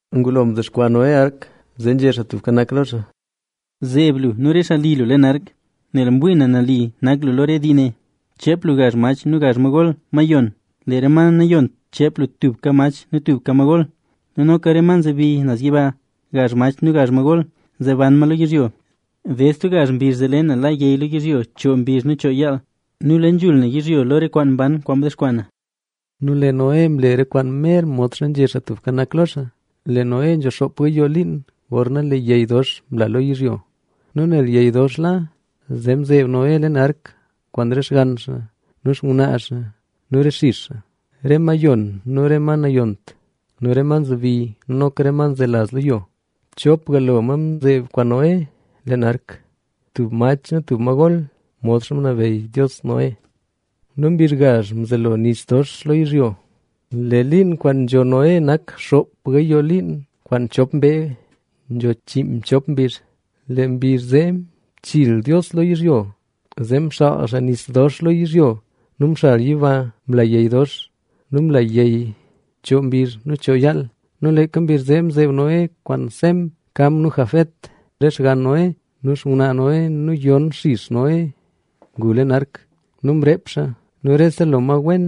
Ngulo mdexkwaa Noé ark, zee nzhé Xaa Tubka Nak lo xaa: —Zeeb lu nu re xaa li lu leen ark, nel mwii na nali nak lu lo re dii ne. Cheep lu gazh mach nu gazh ma gol, ma yon; lee re ma nayont, cheep lu tuka mach nu tuka ma gol. Nu noka re ma nzebi naz yiba, gazh mach nu gazh ma gol, zee ban ma lo yizhyo. Ded stub gazh mbizh zee le na la yey lo yizhyo choo mbizh nu choo yaal. Nu le nzhul na yizhyo lo re kwaan mban kwaan mdexkwaa na. Nu lee Noé mle re kwaan mer modxa nzhé Xaa Tubka Nak lo xaa. Lee Noé nzho xoop gayoo liin gorna lee yey dox mla lo yizhyo. Nu nel yey dox la, zee mzeeb Noé leen ark kwaan re xgann xaa nu xngwnaa xaa nu re xix xaa. Re ma yon nu re ma nayont nu re ma nzebi nu noka re ma nzelaz lo yo, chopga lo ma mzeeb kwaan Noé leen ark, tub mach nu tub ma gol, modxa ngunabeyy Dios Noé. Nu mbizh gazh mzelo nis dox lo yizhyo. Lee liin kwaan nzho Noé nak xoop gayoo liin kwaan chop mbee nzho chiinmchop mbizh. Lee mbizh zee mchiil Dios yizhyo, zee mxaal xaa nis dox lo yizhyo nu mxal yiba mla yey dox. Nu mla yey choo mbizh nu choo yaal. Nu leeka mbizh zee mzeeb Noé kwaan Sem, Cam nu Jafet, re xgann Noé nu xngwnaa Noé nu yon xix Noé ngu leen ark. Nu mreep xaa nu rese lo ma wen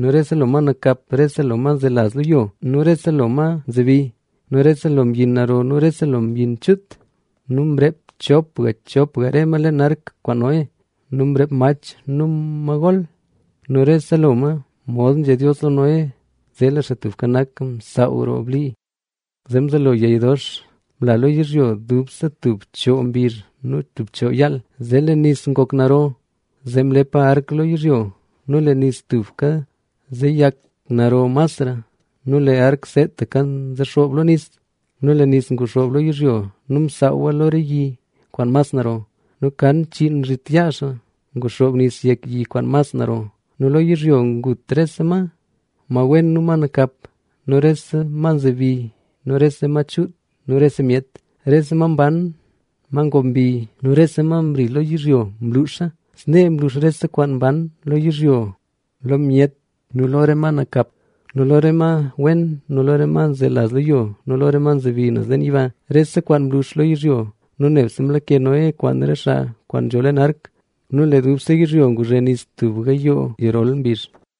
nu rese lo ma nakap, rese lo ma nzelaz lo yo nu rese lo ma nzebi nu rese lo mbyin naro nu rese lo mbyin chuut. Nu mreep chopga chopga re ma leen ark kwaan Noé. Nu mreep mach nu ma gol. Nu rese lo ma mod nzhé Dios lo Noé. Zee lee Xaa Tubka Nak msaaw roo blii. Zee mzelo yey dox mla lo yizhyo, dubse tub choo mbizh nu tub choo yaal. Nu zee lee nis ngok naro, zee mlepa ark lo yizhyo. Nu lee nis tubka nzeyak naro masra nu lee ark seetaka nzexoob lo nis. Nu lee nis nguxoob lo yizhyo nu msaawa lo re yi kwaan mas naro; nu kan chiin zhit yaa xaa nguxoob nis yek yi kwaan mas naro. Nu lo yizhyo ngut rese ma, ma wen nu ma nakap nu rese ma nzebi nu rese ma chuut nu rese myet. Rese ma mban, ma ngoob mbi nu rese kwaan mri lo yizhyo mluxa. Snee mlux rese kwaan mban lo yizhyo lo myet nu lo re ma nakap nu lo re ma wen nu lo re ma nzelaz lo yo nu re ma nzebi naz leen yiba. Rese kwaan mlux lo yizhyo. Nu nebse mlake Noé kwaan re xaa kwaan nzho leen ark. Nu lee dubse yizhyo nguzhe nis tub gayoo yirol mbizh.